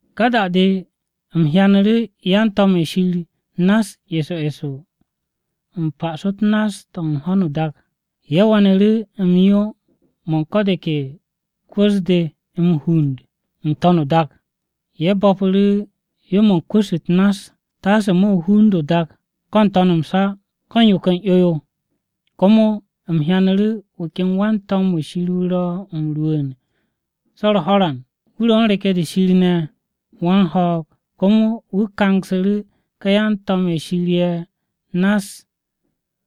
Ka da-de u̱m hyanu̱ru̱ yan-to̱m-ye̱ Shir nass eso eso u̱n pa'aso-u̱t nass-to̱ u̱n ho̱no o-dak. Ye̱ we̱nu̱ru̱ m-yo mo̱ u̱n ko̱ de ke kwu̱ss-de m-hund n-to̱n o-dak. Ye̱ bo̱pu̱ru̱ yo-mo̱ u̱n kwu̱ss-u̱t nass taase mo̱ hund o-dak ko̱ n-to̱n m-sa ko̱ u̱n yo ken 'yo-yo. Komo u̱m hyanu̱ru̱ wu̱ ken wan-to̱m-wu̱ Shir wu̱ ro̱ m-rwu̱u̱n so̱ u̱r-ho̱ran. Wu̱ ro̱ u̱n reke̱-de Shir ne̱ wan-ho̱o̱g. Komo wu̱ kangsu̱ru̱ ka yan-to̱m-ye̱ Shir ye̱ nass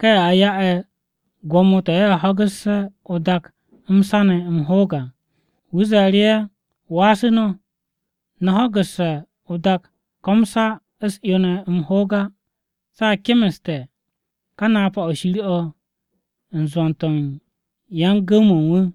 ka ye̱ a ya'e̱ gwo̱mo-to̱ ye̱ ho̱gu̱sse̱ o-dak m-sa ne̱ m-hoog à. Wu̱ ze̱e̱ru̱ ye̱, “Wasu̱ no̱! No̱ ho̱gu̱sse̱ o-dak ko̱ m-sa u̱s-'yo ne̱ m-hoog á se̱ a kemeste̱ ka reke̱-de Shir de u̱n zwo̱n-to̱ u̱n yan-gu̱w-mo̱ u̱n wu̱.”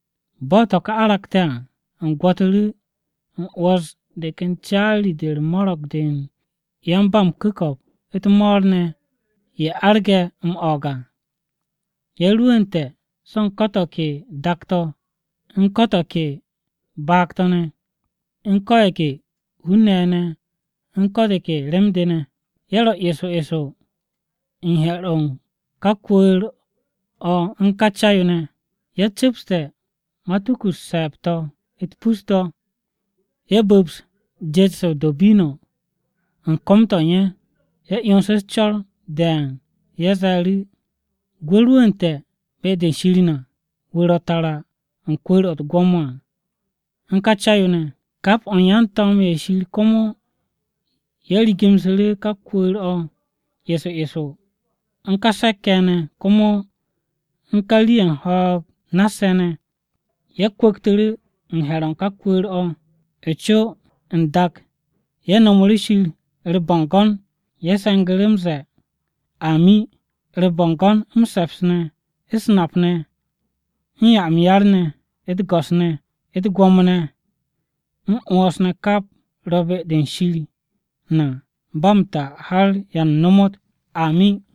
Bo̱ to̱ ka aragte̱ à, u̱m gwo̱tu̱ru̱ u̱m 'wo̱s de ken caari-de u̱r-mo̱ro̱g de u̱n yan-ba-m-ku̱ko̱p u̱t-mo̱o̱r ne̱ ye̱ arge̱ m-o̱o̱g à. Ye̱ rwu̱u̱nte̱ so̱ u̱n ko̱ to̱ ke dak-to̱, u̱n ko̱ to̱ ke baag-to̱ ne̱, u̱n ko̱ ye̱ ke hun-ne̱ ye̱ ne̱, u̱n ko̱ de ke rem-de ne̱. Ye̱ ro̱ eso eso he̱r-o̱ u̱n ká kwu̱u̱r-o̱ u̱n co-o̱ u̱n ká Ca-yo. Ye̱ cu̱pste̱ matuku-u̱t se̱e̱b-to̱ u̱t-pus to̱, ye̱ bu̱ps jet-se o-do̱bino̱ u̱n kom-to̱ u̱n ye̱. Ye̱ 'yonsu̱ u̱s-co̱r de̱e̱n ye̱ ze̱e̱ru̱, “Gwu̱ rwu̱u̱nte̱ be-de u̱n Shir na, wu̱ ro̱ tara u̱n kwu̱u̱r-o̱ u̱t-gwo̱mo à, u̱n ká Ca-yo ne̱!” Kap o̱ u̱n yan-to̱m-ye̱ u̱n Shir komo ye̱ rigu̱msu̱ru̱ ká kwu̱u̱r-o̱ eso eso, u̱n ka se̱k-ye̱ ne̱, komo u̱n ká rii-ye̱ u̱n ho̱o̱g nass-ye̱ ne̱. Ye̱ kwu̱ktu̱ru̱ u̱n he̱r-o̱ u̱n ká kwu̱u̱r-o̱, o-co n-dak ye̱ nomoru̱ Shir u̱r-bo̱ngo̱n. Ye̱ se̱ngu̱ru̱ m-ze̱e̱, “Amin! U̱r-bo̱ngo̱n, m-se̱ps ne̱, u̱s-nap ne̱, u̱n 'ya m-yar ne̱, u̱t-go̱s ne̱, u̱t-gwo̱mo ne̱, m-'wo̱ns ne̱ kap ro̱ be-de Shir na ba m-ta har ya nomot! Amin!”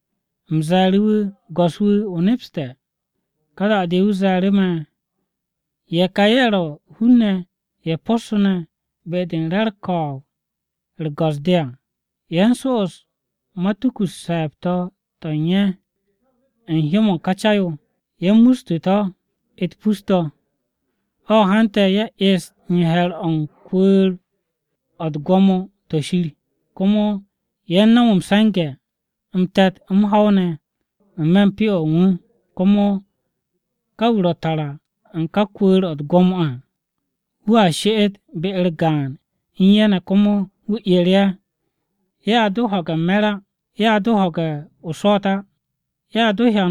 U̱m ze̱e̱ru̱ wu̱, “Go̱s-wu̱, o nepste̱.” Ka da-de wu̱ ze̱e̱ru̱ me̱, “Ye̱ ka ye̱ ro̱ hun-ne̱ ye̱ possu̱ne̱ be-de u̱n re̱ u̱r-ko̱o̱b u̱r-go̱s-de à. Ye̱ u̱n so'os matuku-u̱t se̱e̱b-to̱ to̱ u̱n ye̱ u̱n hyó-mo̱ u̱n ká Ca-yo, ye̱ mustu̱ to̱ u̱t-pus to̱. “O̱ hante̱ ye̱ est u̱n he̱r-o̱ u̱n kwu̱u̱r-o̱ u̱t-gwo̱mo to̱ Shir, komo ye̱ u̱n no̱m m-se̱nge̱ m-te̱t, m-ho̱w ne̱ n-me̱ u̱n Pyo-o̱ u̱n wu̱. Komo ka wu̱ ro̱ tara u̱n ka kwu̱u̱r-o̱ u̱t-gwo̱mo à wu̱a she'et be-u̱r gaan u̱n ye̱ ne̱ komo wu̱ 'er ye̱. Ye̱a do ho̱ge̱ m-me̱r á, ye̱a do ho̱ge̱ o-swo̱o̱t á, ye̱a do hyan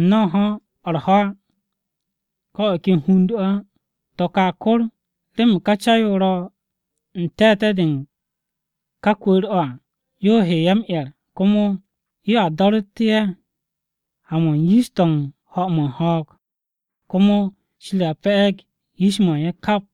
n-no̱o̱nho̱-o̱ u̱r-ho̱ á ko̱ o̱ ken hund-o̱ á. To̱ ka a kor remen ká Ca-yo ro̱ u̱n te̱te̱-de u̱n ka kwu̱u̱r-o̱ à yo he ye̱ m-'er. Komo yo a do̱ru̱tte̱ ye̱ ha-mo̱ u̱n yish-to̱ u̱n ho̱-mo̱ u̱n ho̱o̱g. Komo Shir a pe̱'e̱g yish-mo̱ u̱n ye̱ kap.”